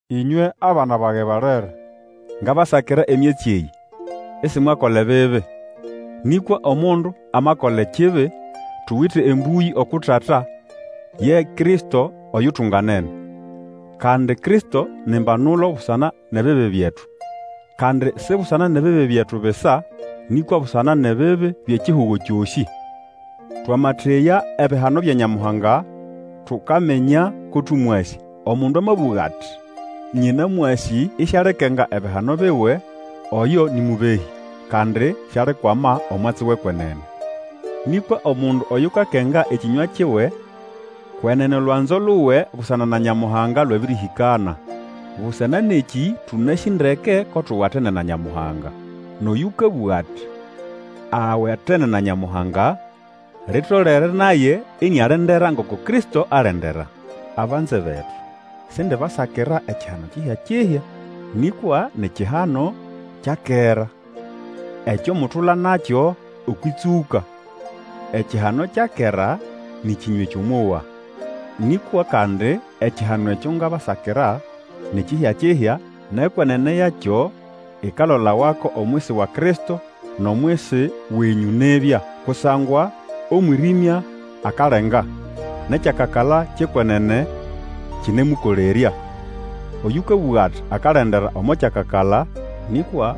Ĩnywe, abana bage balere, ngabasakira emyatsi eyĩ, isimwakola ebibi. Nĩkwa omundu amakola ekibi, tuwite Embũyĩ uku Tata, ye Kristo oyutunganene. Kandi Kristo ni mbanulo busana nʼebibi byetu, kandi si busana nʼebibi byetu bisa, nĩkwa busana nʼebibi byʼekihugo kyosĩ. Twamateya ebihano bya Nyamuhanga, tukaminya ko tũmwasĩ. Omundu amabũga ati, Nyĩnamwasĩ, isialikenga ebihano biwe, oyo nĩ mũbehĩ, kandi sialikwama omwatsi wʼekwenene. Nĩkwa omundu oyukakenga ekĩnywa kiwe, kwenene olwanzo luwe busana na Nyamuhanga lwabĩrĩhĩkana. Busana nʼekĩ tũnasĩ ndeke ko tuwatene na Nyamuhanga. Nʼoyũkabũga ati awatene na Nyamuhanga, litolere naye inialendera ngoko Kristo alendera. Abanze betu, sindibasakira ekihano kihya-kihya, nĩkwa ni kihano kya kera, ekyo mutula nakyo okwʼĩtsũka. Ekihano kya kera nĩ kĩnywa ekyo mwowa. Nĩkwa kandi ekihano ekyo ngabasakira ni kihya-kihya, nʼekwenene yakyo ikalolawako omwisi wa Kristo nʼomwisi wenyũ nibya. Kusangwa omwĩrĩmya akalenga, nʼekyakakala kyʼekwenene kĩnemũkolerya. Oyũkabũga ati akalendera omo kyakakala, nĩkwa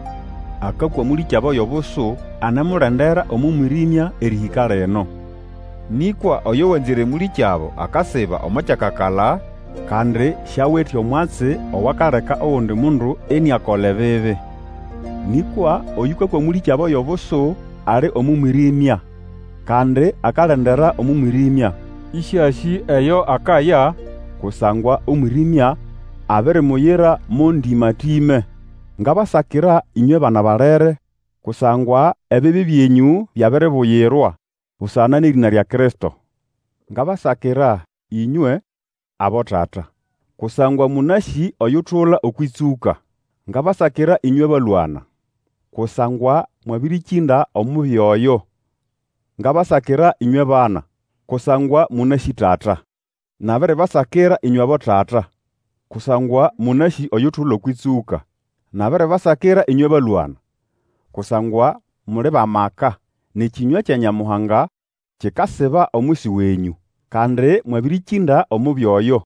akakwa mũlĩkyabo yʼobusu anemulendera omo mwĩrĩmya erĩhĩka lino. Nĩkwa oyo wanzĩre mũlĩkyabo akasiba omo kyakakala, kandi siawite omwatsi owakaleka ogundi mundu iniakola ebibi. Nĩkwa Oyũkakwa mũlĩkyabo yʼobusu, ali omo mwĩrĩmya, kandi akalendera omo mwĩrĩmya, ĩsĩasĩ eyo akaya, kusangwa omwĩrĩmya abirimuyira mo ndĩma-tĩme. Ngabasakira ĩnywe bana balere, kusangwa ebibi byenyũ byabiribuyirwa busana nʼerĩna lya Kristo. Ngabasakira ĩnywe, abotata, kusangwa mũnasĩ oyutula okwʼĩtsũka. Ngabasakira ĩnywe balwana, kusangwa mwabĩrĩkĩnda Omubi Oyo. Ngabasakira, ĩnywe bana, kusangwa mũnasĩ Tata. Nabiribasakira ĩnywe abotata, kusangwa mũnasĩ oyutula okwʼĩtsũka. Nabiribasakira, ĩnywe balwana, kusangwa muli bʼamaka, nʼekĩnywa kya Nyamuhanga kikasiba omwisi wenyũ. Kandi mwabĩrĩkĩnda Omubi Oyo.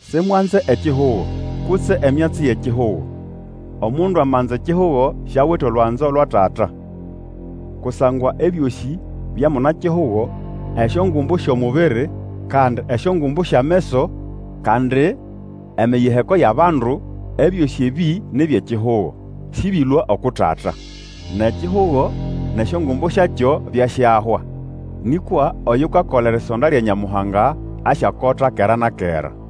Simwanze ekihugo, kutse emyatsi eyʼekihugo. Omundu amanza ekihugo siawite olwanzo lwa Tata. Kusangwa ebyosĩ bya muna-kihugo, esyongumbu syʼomubiri, kandi esyongumbu syʼameso, kandi emiyiheko yʼabandu, ebyosĩ ebĩ ni byʼekihugo, sĩbyelũa uku Tata. Nʼekihugo, nʼesyongumbu syakyo, byasyahwa. Nĩkwa oyukakola erisonda lya Nyamuhanga asyakota kera na kera.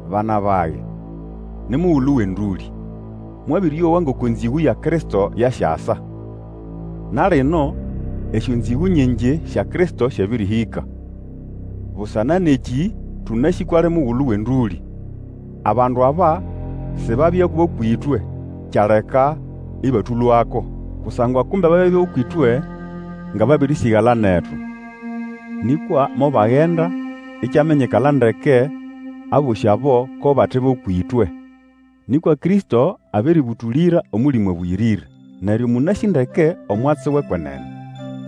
Bana bage, ni mugulu wʼendũlĩ. Mwabĩrĩowa ngoko enzĩgũ ya Kristo yasyasa. Na lino esyonzĩgũ nyingi sya Kristo syabĩrĩhĩka; busana nʼekĩ tũnasĩ kwʼali mugulu wʼendũlĩ. Abandu aba sibabya bʼũkwʼĩtwe, kyaleka ĩbatũlũako. Kusangwa kumbe babya bʼũkwʼĩtwe, nga babĩrĩsĩgala netu. Nĩkwa mobagenda ikyaminyikala ndeke abosĩ abo ko bate bʼũkwʼĩtwe. Nĩkwa Kristo abĩrĩbũtũlĩra Omũlĩmũ Abũyĩrĩre, neryo mũnasĩ ndeke omwatsi wʼekwenene.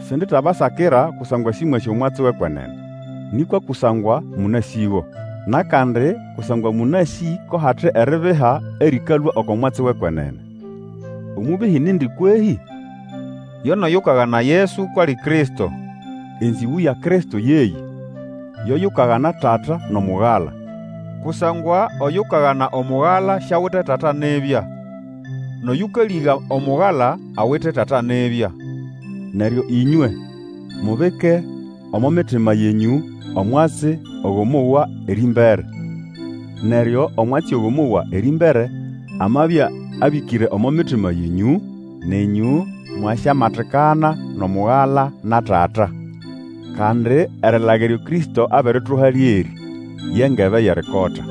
Sinditabasakira kusangwa sĩmwasĩ omwatsi wʼekwenene, nĩkwa kusangwa mũnasĩgo. Nʼakandi kusangwa mũnasĩ ko hate eribiha erĩkalũa oko mwatsi wʼekwenene. Omũbehĩ nindi kwehĩ? Yo nʼoyukagana Yesu kwʼali Kristo. Enzĩgũ ya Kristo yeyĩ, yo yukagana Tata nʼomugala. Kusangwa oyukagana Omugala siawite Tata nibya, nʼoyũkalĩga Omugala awite Tata nibya. Neryo ĩnywe, mubike omo mitima yenyũ omwatsi ogo mwowa erĩmbere. Neryo omwatsi ogo mwowa erĩmbere amabya abĩkĩre omo mitima yenyũ, nenyũ mwasyamatikana nʼomugala na Tata. Kandi erilaga eryo Kristo abirituha lyerĩ, ye ngebe yʼerikota.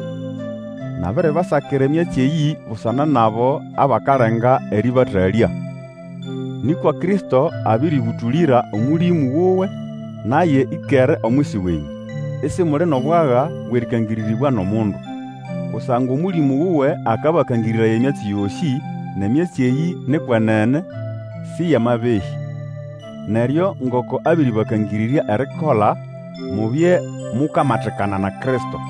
Nabiribasakira emyatsi eyĩ busana nʼabo abakalenga erĩbatalya. Nĩkwa Kristo abĩrĩbũtũlĩra Omũlĩmũ wuwe, naye ĩkere omwisi wenyũ; isimuli nʼobwaga bwʼerĩkangĩrĩrĩbwa nʼomundu. Kusangwa Omũlĩmũ wuwe akabakangĩrĩraya emyatsi yosĩ, nʼemyatsi eyĩ ni kwenene, sĩ yʼamabehĩ. Neryo ngoko abiribakangĩrĩrya erikola, mubye mukamatikana na Kristo.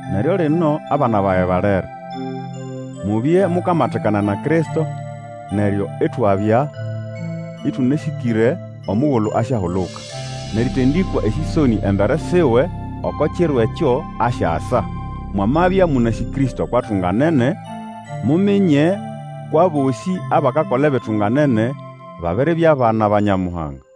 Neryo lino, abana bage balere, mubye mukamatikana na Kristo, neryo itwabya ĩtũnasĩkĩre omugulu asyahuluka, nʼerĩtĩndakwa esĩsonĩ embere siwe oko kiro ekyo asyasa. Mwamabya mũnasĩ Kristo kwʼatunganene, muminye kwʼabosĩ abakakola ebitunganene, babiribya bana ba Nyamuhanga.